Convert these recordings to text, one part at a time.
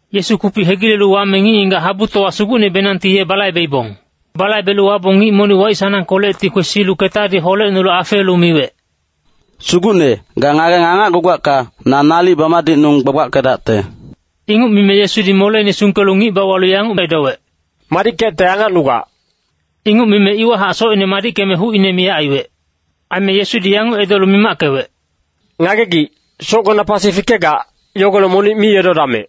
Yesu kupic hegilelu wame ngic-ngigac habutowa sugucnebenangti ye balaibeibong. Balaibelu wabong ngic monic waic-sanangkolecti kwesilu ketadi holecnolu afeelu miwec, “Sugucne, ga ngageng angacgugacka, na nalic bamadicnung gbagbackedacte.” Inguc mime Yesudi moleine sungkelu ngic bauwalu yanguc edowec, “Madickecte angacnugac.” Inguc mime iwahac socine madickeme hucine miyac aiwec. Aime Yesudi yanguc edolu mimackewec, “Ngagegic, socgona pasi fikegac, yogolec monic mi edodamec.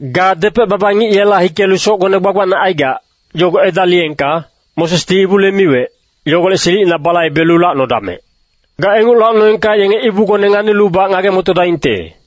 Ga depec-baba ngic yela hikelu socgone gbagbacne aigac, yogo edaliyengka, Mosesdi ibule miwec, yogolec silicina balaibelu lacnodamec! Ga inguc lacnoengka yenge ibugone nganilubac ngage-motodaingte.”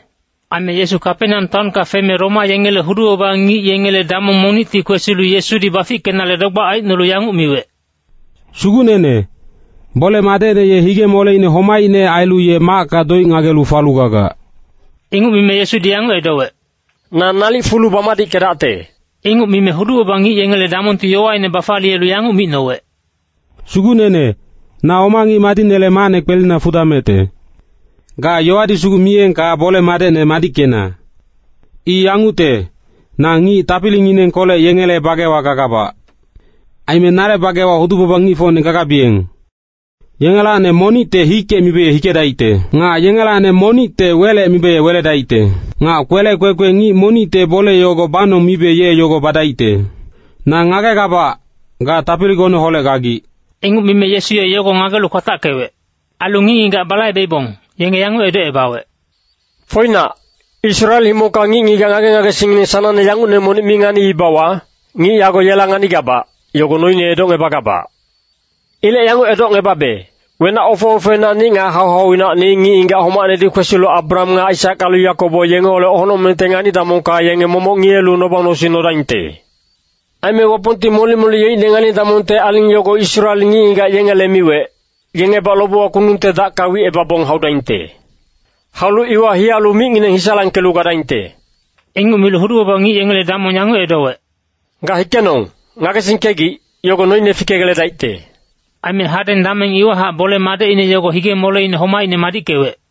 Aime Yesu Kapeneam taonka feme Roma yengele hudu-baba ngic yengele damong monicti kwesilu Yesudi bafickenale dogbac aicnolu yanguc miwec, “Sugucnene, bole-madecne ye hige-moleine homaicne ailu ye macka doic ngagelu falu gagac.” Inguc mime Yesudi yanguc edowec, “Na nalic fulu bamadickedacte.” Inguc mime hudu-baba ngic yengele damongti yowaine bafaliyelu yanguc micnowec, “Sugucnene, na oma ngic madicnele macne kwelina fudamecte. Ga yowadi sugu miyengka bole-madecne madickena. I yangucte, na ngic tapilinginengkolec yengele bagewa gagabac. Aime nale bagewa hudu-baba ngicfocne gagabiyeng. Yengelacni monicte ‘hikec’ mibe ye hikedaicte. Nga yengelacni monicte ‘welec’ mibe ye weledaicte. Nga kwelec kwekwe ngic monicte ‘bole yogo banong’ mibe ye yogo badaicte. Na ngagegabac, ga tapiligoneholec gagic.” Inguc mime Yesu ye yogo ngagelu kwatackewec. Ailu ngic-ngigac balaibeibong, yenge yanguc edocebawec, “Foinac, Israel himongka ngic-ngigac ngage-ngagesingngineng sanangne yangucne monic mi nganiibawa, ngic yago yela nganigabac, yogo noine edocngebagabac. Ilec yanguc edocngebabe, wenac ofe-ofeinacni nga hau-hauinacni ngic-ngigac homacnedi kwesilu Abraham nga Aisak ailu Yakobo yengeholec honocmengte ngani-damongka yenge momoc ngiyelu noba-nosing nodaingte. Aime Wapongti molic-molic yeicne ngani-damongte aling yogo Israel ngic-ngigac yengele miwec, yengebac lobewa kundungte dacka wicebabong haudaingte. Haulu iwa hiyalu micngineng hisalangkelu gadaingte.” Inguc milu hudu-baba ngic yengele damong yanguc edowec, “Ga hikenong, ngagesingkegic, yogo noine fikegeledaicte.” Aime hadeng dameng iwahac bole-madecine yogo hige-moleine homaicne madickewec.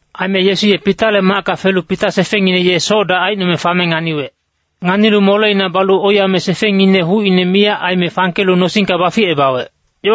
Aime Yesu ye Pitale macka felu Pita sefengngine ye soc-dac aicnome fame nganiwec. Nganilu moleina balu oiyame sefengngine hucine miyac aime fangkelu nosingka baficebawec.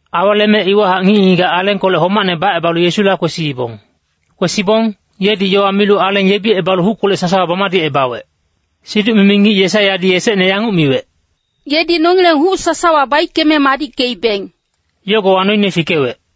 Aweleme iwahac ngic-ngigac alengkolec homacne bacebalu Yesula kwesiibong. Kwesibong, yedi yowa milu aleng yebicebalu huckolec sasawa bamadicebawec. Siduc-mimi ngic Yesaiyadi esecne yanguc miwec, “Yedi nongileng huc sasawa baickeme madickeibeng.” Yogowa noine fikewec.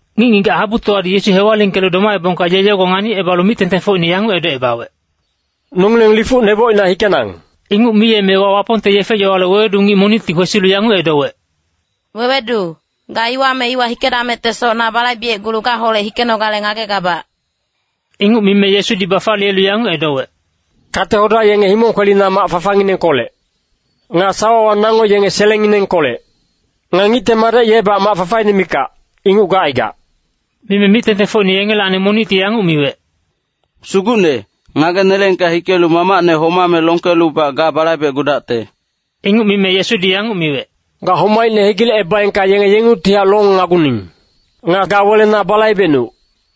Ngic-ngigac habutowadi Yesu hewalingkelu domabong ye yogo nganicebalu mic-tengtengfocine yanguc edocebawec, “Nongileng lifuc nebocina hikenang.” Inguc miyemewa Wapongte yefe-yowale wewedu ngic monicti kwesilu yanguc edowec, “Wewedu, ga iwa me iwa hikedamectesoc na balaibecgulu gaholec hikenogale ngagegabac.” Inguc mime Yesudi bafaliyelu yanguc edowec, “Kate-hoda yenge himong kwelina mac fafanginengkolec. Nga sawawa nango yenge selengnginengkolec. Nga Ngicte Madec yebac mac fafaine mikac, inguc gacaigac.” Mime mic-tengtengfocine yengelacni monicti yanguc miwec, “Sugucne, ngageneleengka hikelu mamacne homame longkelubac ga balaibecgudacte.” Inguc mime Yesudi yanguc miwec, “Ga homaicne hegilecebaengka yenge yengungtihac longnaguning. Nga ga wele na balaibecnuc.”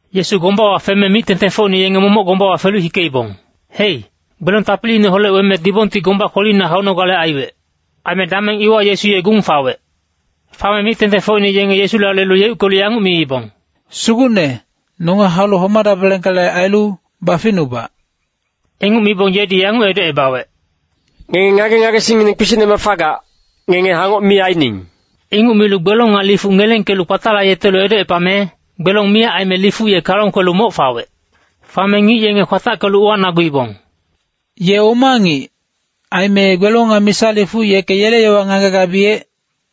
Yesu gombawa feme mic-tengtengfocine yenge momoc gombawa felu hikeibong. Hei, gbelong tapiliineholec weme dibongti gomba kwelina haunogale aiwec. Aime dameng iwa Yesu ye gung fawec. Fame mic-tengtengfocine yenge Yesula lelu yeuckelu yanguc miibong, “Sugucne, nonge haulu homadabelengkale ailu, baficnubac!” Inguc mibong yedi yanguc edocebawec, “Ngenge ngage-ngagesingngineng kpisicnemac fagac, ngenge hangoc mi aining.” Inguc milu gbelong nga lifuc ngelengkelu kpatalayetelu edocepame, gbelong miyac aime lifuc ye kalong kwelu moc fawec. Fame ngic yenge kwatackelu uwanaguibong, “Ye oma ngic, aime gbelong nga misa lifuc yeke yele yowa ngagegabiyec?”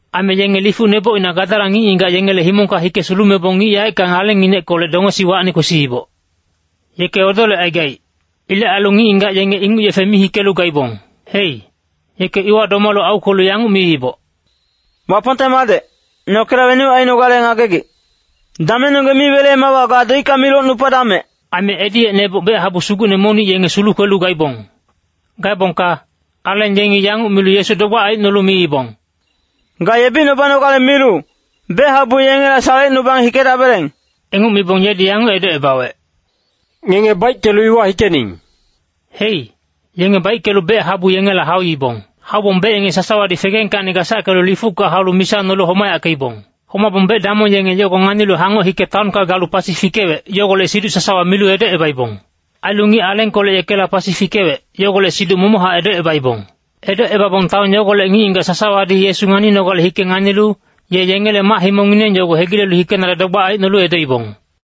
Aime yenge lifuc nebocina Gadara ngic-ngigac yengele himongka hike sulumebong ngic yaeckang alengngineckolec dongesiwacni kwesiiboc. Yeke odolecaigaic. Ilec ailu ngic-ngigac yenge inguc yefe mi hikelu gaibong. Hei, yeke iwa domalu aukwelu yanguc miiboc, “Wapongte Madec, nokela wenuc ainogale ngagegic? Damengnonggeng mi weleemewa ga doicka mi locnupadamec.” Aime ediyec neboc bec-habu sugucne monic yenge sulukwelu gaibong. Gaebongka aleng yengi yanguc milu Yesu dogbac aicnolu miibong, “Ga yebicnubanogale milu, bec-habu yengela salecnubang hikedabeleng.” Inguc mibong yedi yanguc edocebawec, “Ngenge baickelu iwa hikening.” Hei, yenge baickelu bec-habu yengela hauibong. Haubong bec yenge sasawadi fegengkacni gasackelu lifucka haulu misa nolu homayackeibong. Homabong bec-damong yenge yogo nganilu hangoc hike taonka galu pasi fikewec, yogolec siduc sasawa milu edocebaibong. Ailu ngic alengkolec yekela pasi fikewec, yogolec siduc momochac edocebaibong. Edocebabong taon yogolec ngic-ngigac sasawadi Yesu nganinogale hike nganilu, ye yengele mac-himongngineng yogo hegilelu hikenale dogbac aicnolu edoibong.